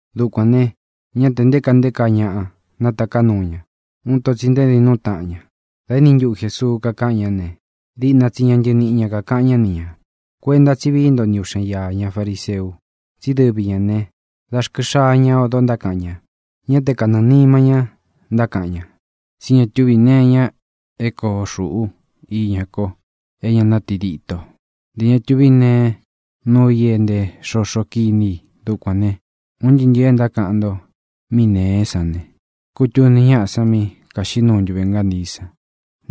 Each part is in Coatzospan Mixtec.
Dukuān ne, ñá tē nté kaa nté kaa ñaꞌa nátaká nuu ña. Uun ito tsi ntaédin nuu taꞌan ña. Dā éni ntuꞌu Jēsuu kakaꞌan ñá ne, diꞌna tsi ña ntɨniꞌi ñā kakaꞌan ñá ni ñā: —Kuenta tsí vií nto ni uꞌxen iā ña fariseu. Tsi dɨ́vi ñā né, da rkɨ xaa ña odo ntákaꞌan ña, ñá te kanɨɨ̄ nima ñá ntákaꞌan ña. Tsí ña túvī nee iña é koo xūꞌú iña ko é ña nátidito; ntē ña tuví ne nuu i é ntē xoxo kiní i. Dukuān ne, un ntɨɨ́ ntɨ̄ɨ e ntákaꞌan nto mí nēé san ne, kūtuni ñáꞌā san mí kāxiꞌí nuu ntuve ngántii san.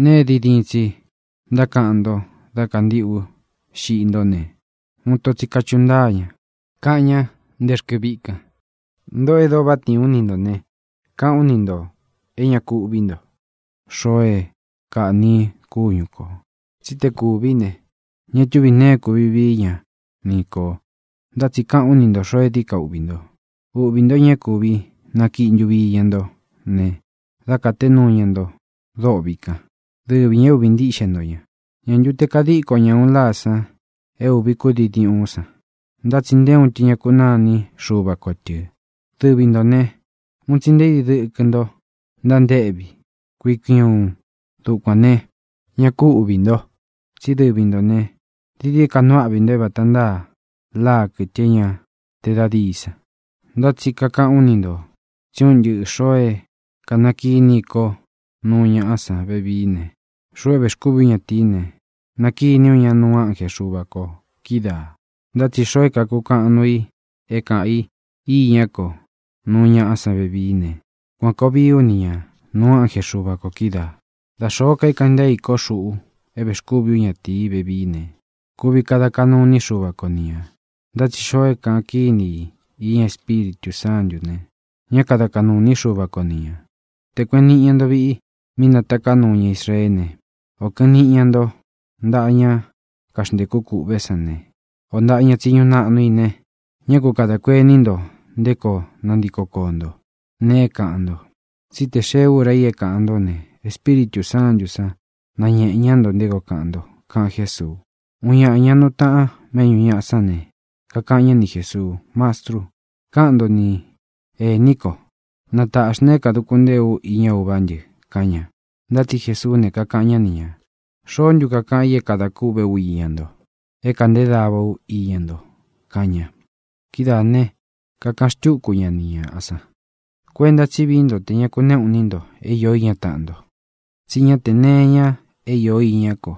Nēe é diin diin tsi ntákaꞌan nto dá kāntiꞌú xiꞌi ntó ne, uun ito tsi kachuꞌu ña, kaꞌan ña nté rkɨ viꞌi kan. ʼNtōꞌo e dóo váꞌa tiin ú ni ntō ne, kakaꞌán u ni ntō é ña ku uꞌví nto xoo é kaꞌní i kúñu kō. Tsí te kúvī ne, ña túvī nee é kuvi vií ka ñá ni kō. Ntá tsi kakaꞌán u ni ntō xoo é dií ka uꞌvī nto. Uꞌvī ntó ña é kūvi nakiꞌi ntuvi iña nto ne, da katé nuu ña nto dôꞌvi kan. Dɨvi ñā é uꞌvi ntíꞌxe nto ña. ʼ¿Ñā ntu te kadíko ña ūꞌun láā san é ūvi kúdii diúꞌun san? Ntá tsi nté uun tɨ ña kakunáa ini Xúva ko tɨ̄. Dɨvi ntō né, un tsi nté idi dɨkɨ nto ntántéꞌvi kui kui uun. Dukuān ne, ñá ku uꞌvī nto. Tsí dɨvi ntō ne, dií dií ka nuu áꞌvi nto é vata ntáa láa, kɨtɨ é ña te da díi san. ʼNtá tsi kakaꞌán u ni ntō tsí un ntɨꞌɨ ntō xoo é kanakiní i ko nuu ñaꞌa san vevií ne, xuꞌu é vēxkúvi ú ñatīí ne, nakiní u ña nuu ánje Xuva kō kídaā. Ntá tsi xoo é kākukaꞌan nuu i é kāꞌán i iñá ko nuu ñaꞌa san vevií ne, kuan kōo vií u ni ñā nuu ánje Xuva kō kídaā. ʼDa xōó ka é kaꞌan ntée i ko, xuꞌu é vēxkúvi ú ñatīí vevií ne, kuvi kada kaꞌnu iní Xuva ko ni ñā. Ntá tsi xoo é kaꞌan kíni i iña Espíritū Sántū ne, ñá kada kaꞌnū iní Xuva ko ni ñā. ʼTē kueꞌen niꞌi ña nto viꞌi mí nataká nuu ña Israeé ne, ō kɨꞌɨn niꞌi ña nto ntáꞌa ña kaxntēku kûꞌve sán ne, ō ntáꞌa ña tsiñu naꞌnu i ne, ñá ku kadā kuení nto nté koo nantiko koō ntó, nee é kāꞌan nto. Tsí tē xee úra i é kāꞌan ntó ne, Espíritū Sántū sán nañēꞌé ña nto nté koo kaꞌan nto —kaꞌan Jésuu. Uun ñāꞌa, ña nuu taꞌan méꞌñū ñaꞌa sán ne, kakaꞌan ñá ni Jēsuu: —Mastru, káꞌan nto ni ēní ko, na tāꞌxi na é kāduku ntée ú iña uvá ntɨ —kaꞌan ña. Ntá tsi Jesuú ne, kakaꞌan ñá ni ñā: —¿Xoó ntu kakaꞌan i é kadā kûꞌvé u iña nto, é kēꞌnté dava ú iña nto? —kaꞌan ña. Kidáā ne, kakaꞌan xtúku ña ni ñāꞌa san: —Kuenta tsí vií nto tē ña kunéꞌū iní nto é īó iña taꞌan nto. Tsí ña te nee é īó iña ko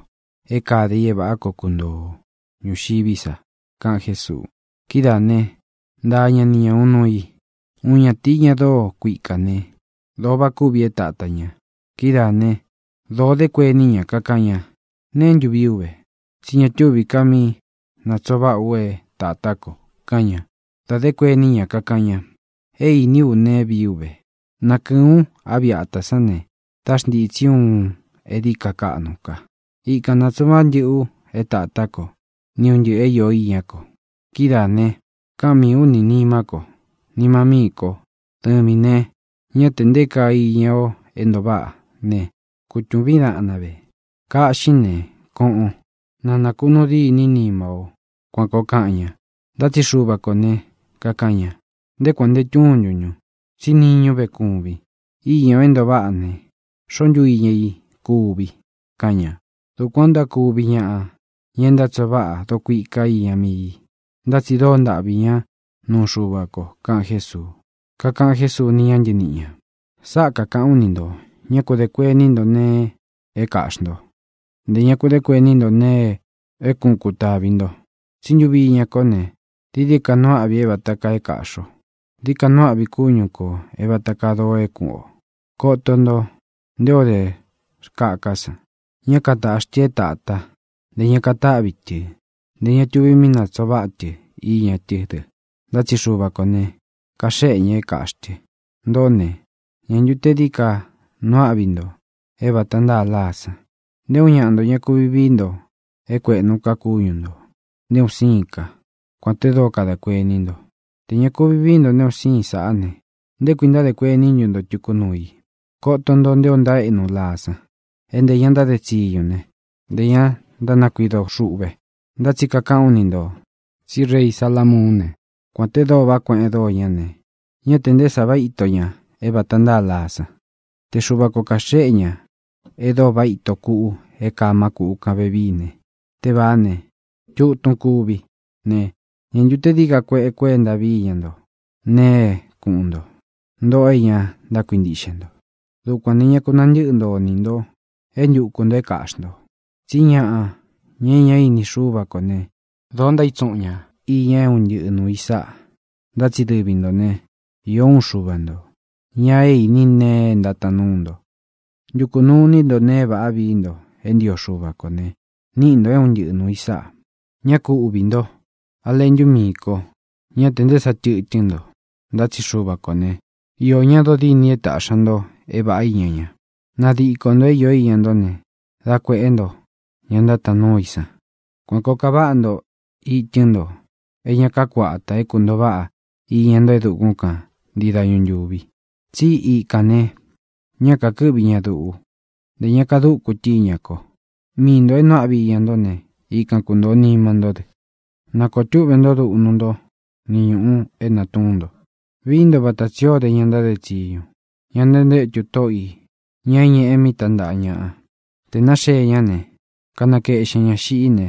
é kade i é vāꞌá koo kuntoo o ñūxiví sa —kaꞌan Jésuu. Kidáā né, ntaa ña ni ñā uun nuu i: —Uun ñatīi, ña dóo kuikā né, dōo váꞌa kúvī é tātá ña. Kidáā né, dōo dé kuení ña, kakaꞌan ña: “¿Neé ntu vii ú ve? Tsí ña túvī ka míꞌī natsoo vaꞌá u é tātá ko”, kaꞌan ña. Dā dé kuení ña, kakaꞌan ña: “É īní u neé vii ú ve. Nakɨɨ̄n ú a viꞌi atā sán ne, dá xntītsí u uun é dií ka kaꞌnu ka. Ikan nātsuꞌun váꞌa ntɨꞌɨ u é tātá ko ni un ntɨꞌɨ̄ é īó iñá ko. Kidáā ne, káꞌan miī ú ni nīmá ko: Nima míi ko, dɨvīn ne, ñá tē nté kaa iña o é ntoo váꞌa ve. Kutuvín daꞌnan ve. Kaꞌxín ne, koꞌon; na nākunuu dîní nima o.” Kuan kōo kaꞌan ña. Ntá tsi Xuva ko ne, kākaꞌan ña: “¡Nté kuān nte túntun ntun! tsí niñú ve kuvin. Iña o é ntoo váꞌa ne, ¿xōo ntú iña i kuvi?”, kaꞌan ña. Dukuan ō ntákuvi ñaꞌa, ña e ntátsoo váꞌa dokuika iña mii i, ntá tsi dóo ntaꞌvī ñá nuu Xuva ko —kaꞌan Jésuu. Kakaꞌan Jésuu ní ña ntɨniꞌi ñā: —Sáꞌa kāꞌán u ni ntō: Ñá ku dē kuení nto nee é kāꞌxi nto; ntē ña ku de kueni nto nee é kuꞌun kutāvi nto. Tsí ntuvi iña kó ne, dií ka nuu áꞌvi é vāta kaa é kāꞌxi o. Dií ka nuu áꞌvi kúñu kō é vāta kaa dóo é kuꞌun ō. Koto nto nté o de rkáka san: Ñá katāꞌxi tɨ é tātá, ntē ña katáꞌvi tɨ, ntē ña tuvi míꞌī ntánatsoo váꞌa tɨ iña tɨ́ dɨ. Ntá tsi Xuva kō ne, kaxéꞌe ña é kāꞌxi tɨ. Ntōꞌó ne, ¿ñā ntu te dií dií ka nuu áꞌvi nto é vāta ntáa láa san? Nté uun ñaꞌa nto ña kuvi vií nto é kuēꞌnu ka kúñu nto, nté un síin ka, kuān te dóo kadā kuení nto. Tē ña kuvi vií nto nte un síin sāꞌá ne, ¿nté kui ntádē kuení ntu nto tuku nuu i? ʼKóto nto nté o ntaéꞌnu láa san, é ntē ña ntáde tsiñu ne, ntē ña ntánakuido xuꞌve. Ntá tsi kakaꞌán u ni ntō tsí rei Salamuún ne, kuān te dóo vaꞌa kueꞌen dóo ñá ne, ñá tē nté sa váꞌa ito ña é vata ntáa láa san. Te Xuva ko kāxéꞌe ña e dóo váꞌa ito kuꞌu é kaa má kūꞌú kān vevií ne, tevāá ne, tutun kuvi ne, ¿ñā ntu te dií ka kueꞌe kuenta víi ña nto nēe é kuꞌun nto, ntōꞌo é ña ntákuintiꞌxe nto? Dukuan ne, ñā ku nantɨ́ꞌɨ nto iní nto é ntuku ntō é kāꞌxi nto. Tsí ñaꞌa, ña é ña ini Xúva kō né, dōo ntaítsuꞌun ña īña é un ntɨꞌɨ nuū i sáꞌa. Ntá tsi dɨvi ntō né, īó uun Xuva ntō, ña é īní nee é ntátaan núu nto. Ntukū nuu iní nto nēe e váꞌā é viī nto é ntio Xuva ko ne, níꞌi ntō é un ntɨꞌɨ nuū i sáꞌā. ʼÑá ku uꞌvī ntó, a leꞌntu míī ko. Ñá tē nté sa tɨtɨ́n nto, ntá tsi Xuva kō ne, iō ñá dodîni é tāꞌxi ña nto é vāꞌá iña ña. Nadiko ntō é īó iña nto ne, dá kuēꞌé nto ña ntátaan núu i san. Kuan kōo kaváꞌa nto itɨ́n nto é ña kakuátā é kuntōo váꞌa iña ntó e dukún kan ntii dañu ntūvi. Tsi íkān ne, ña kakɨ́ꞌvi ña duꞌu, ntē ña kadúku tɨ́ iña ko. Míꞌi ntōo é nuu áꞌvi iña ntó ne, ikan kuntōo nima ntó dɨ. ʼNa kōo túꞌve nto duꞌnu nto ni ñūꞌu é nātuún nto. Vií nto vata tsī o dé ña ntáde tsiñu, ña ntantétu tóꞌo i, ñā é ñeꞌe mi tántaꞌa ñaꞌa. Tē náxee ñá ne, kanakeꞌxen ñā xiꞌí ne,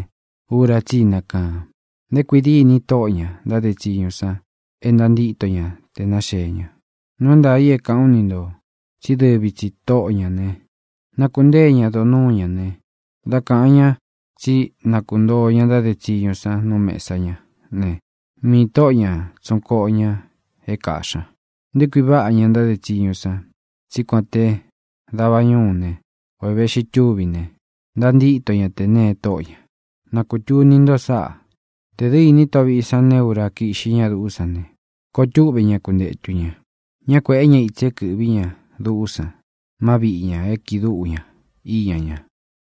ura tsí i nakaan. Nté kui dîni tóꞌō ña ntáde tsiñu san e ntántíto ña te naxēé ña. Nuu é ntaā i é kākaꞌán u ni ntō tsí dɨvi tsī tóꞌo ñā ne, nákuntēé ña donúu ñā ne, da káꞌan ñā tsí na kuntōo ña ntáde tsiñu san nú mēsa ñá ne, mii toꞌo ñā tsuꞌun koꞌo ña é kāꞌxí ña. Nté kui váꞌa ña ntáde tsiñu san, tsí kuān te davá ñūú ne, ō e veꞌxi túvi ne, ntantíto ña tē née tóꞌo ñā. Na kūtuni nto sáꞌā. Tē dɨ́ ini tóꞌō viꞌi san neé ura kiꞌxi ñá duꞌú san ne, koo túꞌve ña kuntētu ña. Ñá kuēꞌé ña itsi é kɨ̄ꞌví ña duꞌú san má viꞌi ñā é kiꞌi dúꞌu ña iña ña.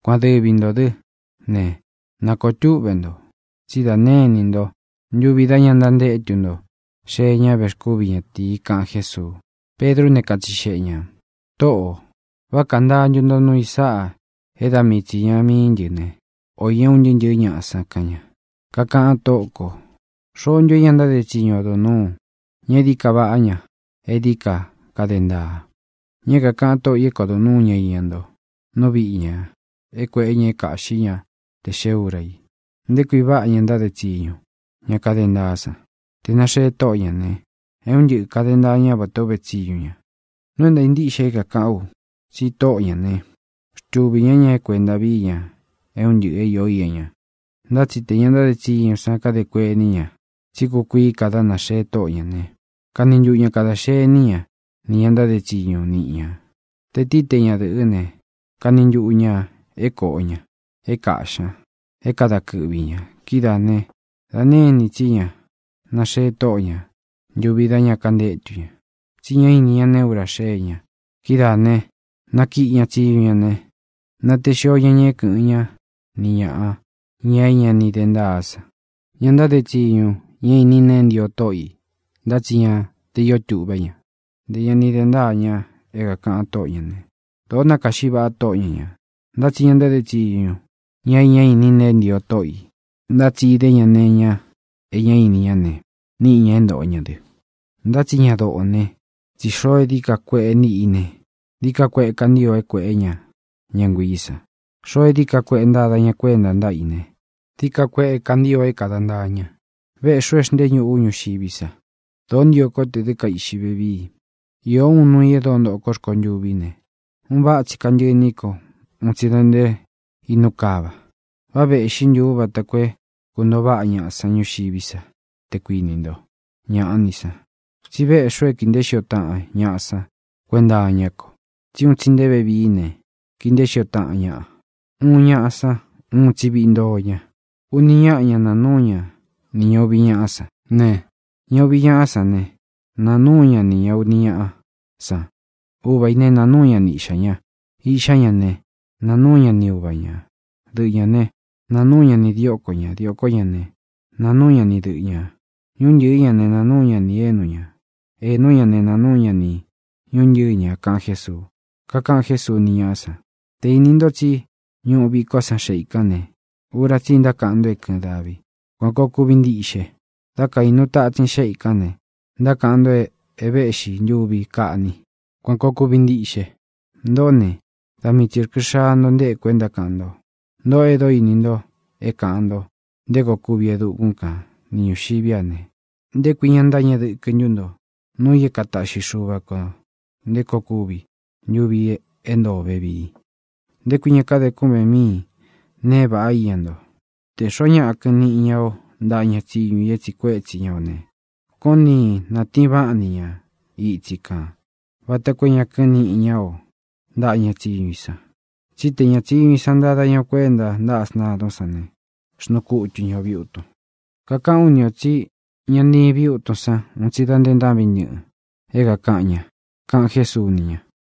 Kuan dɨvi ntō dɨ́ ne, na kōo túꞌve nto, tsí dā née inī nto ntuvi dá ña ntántétu nto xee ña vexkúvi ñatīi —kaꞌan Jésuu. Pedrú ne, katsixeꞌe ñā: —Tōꞌó, ¿vá kantáa ntu nto nuu i sáꞌa é da mii tsi īña mii ntɨ́ ne, ō iña un ntɨɨ́ ntɨ̄ɨ́ ñaꞌa san? —kaꞌan ña. Kakaꞌan Tóꞌo kō: —¿Xoó ntu é ña ntáde tsiñu odo nūu, ña é dií ka vāꞌa, ña é dií ka kade ntaa, ña é kākaꞌan tóꞌo ī é kodo nūu ñá iña ñá ntoo nú viꞌi ñā é kuēꞌé ña é kāꞌxí ña te xee úra i? ¡Nté kui váꞌa ña ntáde tsiñu, ña kade ntaá san! Tē náxee tóꞌo ñā ne, é un ntɨꞌɨ kāde ntaa ñá vatā o uvé tsiñu ña. Nuu é ntāa ntíꞌxe i é kākaꞌán u tsi tóꞌo ña ne, xtuvī ñá ña é kuēnta víi ña é un ntɨꞌɨ̄ é īo íña ña. Ntá tsi te ña ntáde tsiñu san kade kuení ña tsí kukuií ka dá nāxee tóꞌo ñā ne, kani ntuꞌu ña kadā xení ña ni ña ntáde tsiñu niꞌi ña, te tīí, te ñadɨ̄ꞌɨ́ ne, kani ntuꞌu ñā é kōꞌo ña, é kāꞌxí ña, é kada kɨꞌvi ñā. Kidáā ne, da née inī tsí ña naxee tóꞌo ñā ntuvi dá ña kantétu ña, tsí ña íni ña neé ura naxée ña. Kidáā ne, nakiꞌi ña tsiñu ñā ne, natee xío ña ña é kɨ̄ꞌɨn ñá ni ñāꞌa, ña é ña ini de ntáa san. ʼÑa ntáde tsiñu, ña é īní nēe e ntío tóꞌo ī ntá tsi ña te īó tuꞌvé ña, ntē ña ni de ntáa ña é kākaꞌan tóꞌo ñā né, dōo nakáꞌxi vaꞌa tóꞌo ña ñā. Ntá tsi ña ntáde tsiñu, ña e ñá ini nee e ntío tóꞌo ī ntá tsi idé ña nee iña e ñá ini ña ne, níꞌi ñā é ntōꞌo ña dɨ, ntá tsi ña dóo nee. Tsí xoo é dií ka kueꞌe níꞌi i ne, dií ka kueꞌe kantio é kueꞌé ña ña nguiī san. Xoo é dií ka kueꞌe ntada ña kuénta ntáꞌa i ne, dií ka kueꞌe kantio é kāda ntaa ña. ʼVéꞌxī u e xnteé ñuꞌu ú ñuxiví sa. ¡Dōó ntio kó tē dɨ́ kaiꞌxi vevíi! Īo úun nuu i e dóo ntoꞌo kó rkontûví ne, un váꞌa tsi kantɨꞌɨ iní ko un tsi da nte inú kava. ¿Vá vēꞌxí ntu ú vata koo é kuntoo váꞌa ñaꞌa san ñuxiví sa, te kuinī nto? ¡Ñaꞌa ní san! tsí veꞌxí u é kii nteé xio taꞌan ñaꞌa san kuenta iñá ko. Tsí un tsi nte vevií ne, kii nteé xio taꞌan ñaꞌa. Uꞌun ñáꞌa san uun tsi viꞌi ntoo ña. Uni ñáꞌa ña naa núu ña nī ña uvi ñáꞌa sán ne, ña uvi ñaꞌa sán ne, naa núu ña nī ña uni ñáꞌa san. Uva ī ne, naa núu ña ni iꞌxā ña. Iꞌxá ña ne, naa núu ña ni uva ñā. Dɨꞌɨ ñā ne, naa núu ña nī dióko ñā. Diōkó ña ne, naa núu ña ni dɨꞌɨ ñā. Ñúntɨ̄ɨ́ ña ne, naa núu ña nī énu ñā. Ēnú ña ne, naa núu ña nī ñuntɨ́ɨ ña —kaꞌan Jésuu. Kakaꞌan Jésuu ní ñaꞌa san: —Tē íni nto tsí ñuꞌu vikó san xeꞌe i kán ne, ura tsi ntákaꞌan nto é kɨ̄ɨn davi. Kuan kōo kuvi ntiꞌxe. Dá kaīnu tatsin xéꞌe ī kán ne, ntákaꞌan nto é vēꞌxí ntuvi kaꞌni. Kuan kōo kuvi ntiꞌxe. Ntoꞌó ne, da mii tsī rkɨ xaa nto nteku é ntákaꞌan nto. Ntoꞌó e dóo íni nto é kāꞌan nto nté koo kúvi e dukún kan ni ñūxiví a ne, ¿nté kuī ña ntáñeꞌe dɨkɨ ntu nto núu i é kataꞌxi Xuva kō nté koo kuvi ntuvi é ntoo o vevii? ʼ¿Nté kui ña káde kúꞌven míin nee é vāꞌa iña nto? Tē xoó ñaꞌa kɨꞌɨn níꞌi ña o ntaꞌa ña tsíñu i é tsiꞌi kuétsi i ō ne, koón ntiin nātiin váꞌan ni ña itsi kān vata koo é ña kɨ́ꞌɨn niꞌi ña o ntaꞌa ña tsíñu i san. Tsí tē ña tsiñu i san ntada ña o kuénta ntáꞌa sntadún san ne, xnuu kutu ña ō viutun. Kakaꞌán u ni ō tsí ña ntiin viútun san un tsi da nte ntáꞌvin ntɨꞌɨn é kakan ña —kaꞌan Jésuu ni ña.